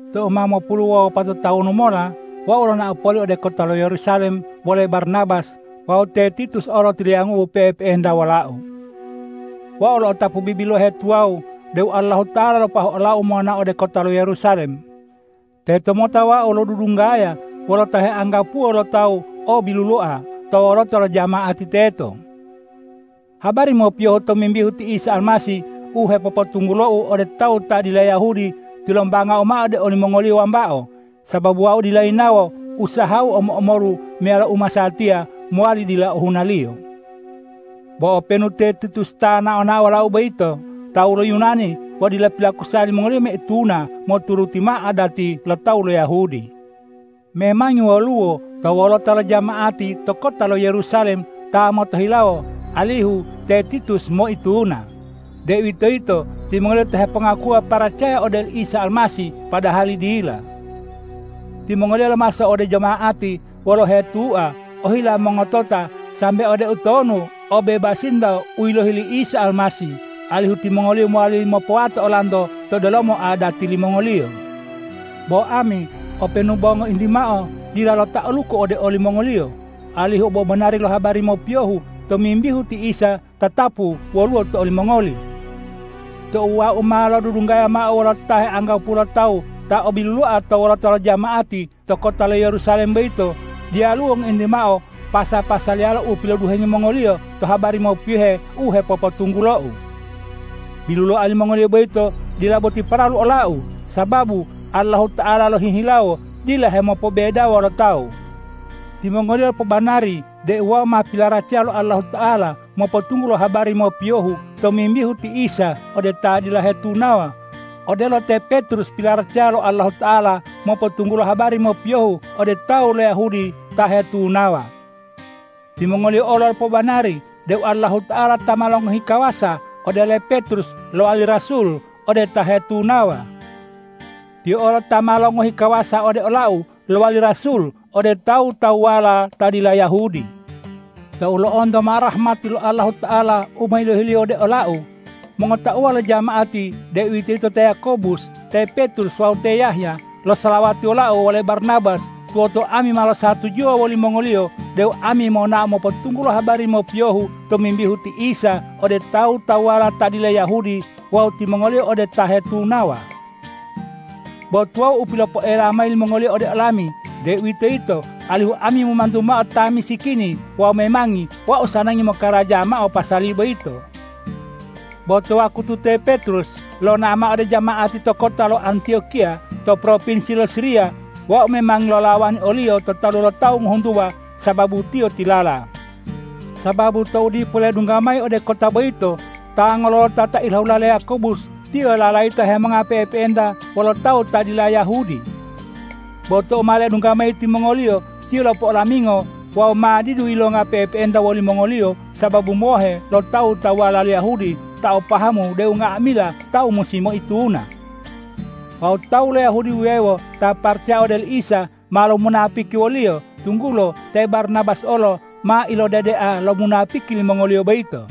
Tou ma mopulu wawu wopato tawunu mola wau lonao poli ode kota lo Yerusalem wole Barnabas wawu te Titus olo tiliyangu'u pe'epe'enta wolau. Wau lo'otapu bibilohe tuwawu deu Allahuta'ala lopoahu olau monao ode kota lo Yerusalem. Tetomota wau lodudunggaya wolo ta heanggapuwo lo tawu o biluloa to wolota lo jama'ati teto. Habari mopiyohu tomimbihu ti Isa Almasih u hepopotunggulou ode tawu ta dila Yahudi tilombangau mao ode olimongoliyo wambao, sababu wau dila yinawo usahau omo-omolu meyalo u masatiya mowali dila ohunaliyo. Bo openu te Titus ta nao-nao wolau boyito tawu lo Yunani bo dila pilakusa limongoliyo moituna moturuti mao adati lo tawu lo Yahudi. Memangi woluwo to wolota lo jama'ati to kota lo Yerusalem ta motohilawo alihu te Titus moituna, deuwitoyito timongoliyo ta hepongakuwa paracaya ode oli Isa Almasih padahali dila. Timongoliyo lomaso ode jama'ati wolo uhetua ohila mongotota sambe ode utonu obebasinto u yilohi li Isa Almasih, alihu timongoliyo mowali mopowato olanto to delomo adati limongoliyo. Bo ami openu bo ngointi mao dila lota'aluku ode olimongoliyo, alihu obobanari lo habari mopiyohu tomimbihu ti Isa tatapu woluwo to olimongoli. Tou wau ma lodudunggaya mao wolo ta heanggapuwo lo tawu ta o biluloa to wolota lo jama'ati to kota lo Yerusalem boyito, diyaluwo ngointi mao pasa-pasaliyala u piloduhengi mongoliyo to habari mopiyohe u hepopotunggulou. Biluloa limongoliyo boyito dila boti paralu olau, sababu Allahuta'ala lohihilawo dila hemopobedawo lo tawu. Timongoliyo lopobanari deu wau ma pilaracaya lo Allahuta'ala mopotunggulo habari mopiyohu tomimbihu ti Isa ode ta dila hetunawa, odelo te Petrus pilaracaya lo Allahuta'ala mopotunggulo habari mopiyohu ode tawu lo Yahudi ta hetunawa. Timongoliyo olo lopobanari deu Allahuta'ala ta ma longohi kawasa ode le Petrus lowali rasul ode ta hetunawa. Tiyo olo ta ma longohi kawasa ode olau lowali rasul ode tawu-tawuwala ta dila Yahudi. Tou lo'onto mao rahmati lo Allahuta'ala u ma yilohi-Liyo ode olau, mongotauwa lo jama'ati deuwitoyito te Yakobus, te Petrus wawu te Yahya, losalawati wolau wole Barnabas tuwoto ami ma losatujuwa wolimongoliyo deu ami monao mopotunggulo habari mopiyohu tomimbihu ti Isa ode tawu-tawuwala ta dila Yahudi wawu timongoliyo ode ta hetunawa. Bo tuwawu u pilopoela mayi limongoliyo ode olami, deuwitoyito alihu ami momantu mao ta misikini wawu memangi wau sanangi mokaraja mao pasali boyito. Bo to wakutu te Petrus lonao mao ode jama'ati to kota lo Antiyokiya to propinsi lo Siriya, wau memangi lolawani oliyo to talu lo tawu ngohuntuwa sababu tiyo tilala. Sababu tou dipo ledungga mayi ode kota boyito ta ngololota ta ilahula le Yakobus, tiyo lalayita hemonga pe'epe'enta wolo tawu ta dila Yahudi. Bo tou ma ledungga mayi timongoliyo, tiyo lopo'olamingo wawu ma didu yilonga pe'epe'enta wolimongoliyo sababu mohe lo tawu-tawuwala lo Yahudi ta o pahamu deu nga'amila tawu musi moituna. Wawu tawu lo Yahudi wuwewo ta paracaya ode oli Isa ma lomunapiki woliyo, tunggulo te Barnabas olo ma ilodedea lomunapiki limongoliyo boyito.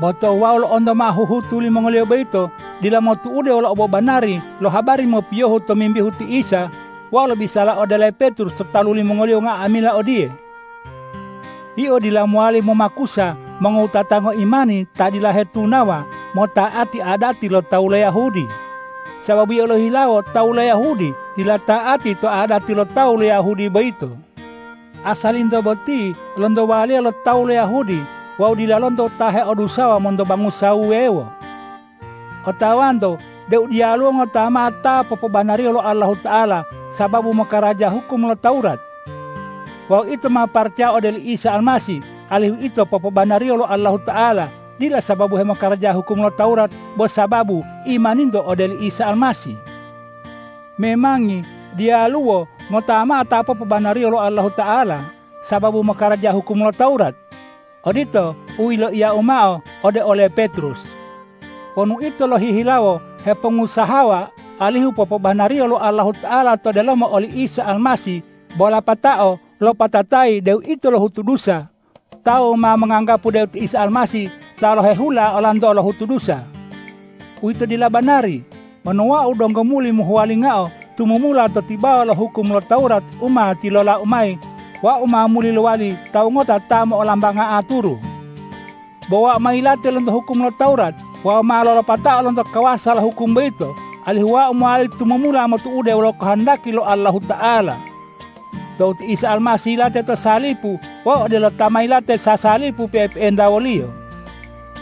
Bo tou wau lo'onto mao huhutu limongoliyo boyito dila motu'ude wolo obobanari lo habari mopiyohu tomimbihu ti Isa, wau lobisala ode ole Petrus to talu limongoliyo nga'amila odiye,”Yio dila mowali momakusa mongowutata ngoimani ta dila hetunawa mota'ati adati lo tawu lo Yahudi, sababu yio lohihilawo tawu lo Yahudi dila ta'ati to adati lo tawu lo Yahudi boyito. Asalinto boti lonto waliya lo tawu lo Yahudi wawu dila lonto ta heodusawa monto bangusa wuwewo. Otawanto deu diyaluwo ngota mao ta popobanariyo lo Allahuta'ala sababu mokaraja hukum lo Tawurat. Wawu ito ma paracaya ode oli Isa Almasih alihu ito popobanariyo lo Allahuta'ala, dila sababu hemokaraja hukum lo Tawurat, bo sababu imaninto ode oli Isa Almasih. Memangi diyaluwo ngota mao ta popobanariyo lo Allahuta'ala sababu mokaraja hukum lo Tawurat.” Odito u yiloiyau mao ode ole Petrus. Wonu ito lohihilawo hepongusahawa alihu popobanariyo lo Allahuta'ala to delomo oli Isa Almasih bo lapatao lopatatayi deu ito lohutu dusa, tawu ma monganggapu deu ti Isa Almasih ta lohehula olanto lohutu dusa. Uwito dila banari. Wonu wau donggo muli mohuwalingao tumumula to tibawa lo hukum lo Tawurat u ma tilolau mayi, wau ma muli lowali tawu ngota ta mollambanga aturu. Bo wau ma yilate lonto hukum lo Tawurat wawu ma lolopatao lonto kawasa to hukum boyito, alihu wau mowali tumumula motu'ude wolo kohondaki lo Allahuta'ala. Tou ti Isa Almasih yilate to salipu, wau odelo ta ma yilate sasalipu pe'epe'enta wo-Liyo.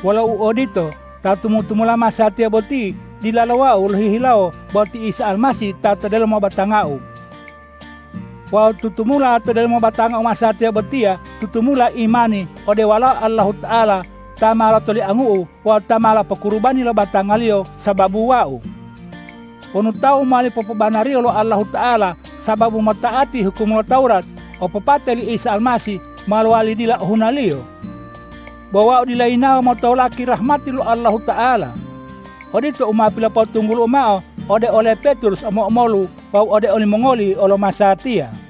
Wolo uodito, ta tumu-tumula masatiya boti dilalo wau lohihilawo bo ti Isa Almasih ta to delomo batangau. Wawu tutumula to delomo batangau masatiya botiya tutumulo imani ode Walao Allahuta'ala ta ma lotoliangu'u wawu ta ma lopokurubani lo batanga-Liyo sababu wau. Wonu tawu mowali popobanariyo lo Allahuta'ala sababu mota'ati hukum lo Tawurat, opopate li Isa Almasih ma lowali dila ohunaliyo. Bo wau dila yinawo motolaki rahmati lo Allahuta'ala. Odito u ma pilopotunggulu'u mao ode ole Petrus omo-omolu wawu ode olimongoli olo masatiya.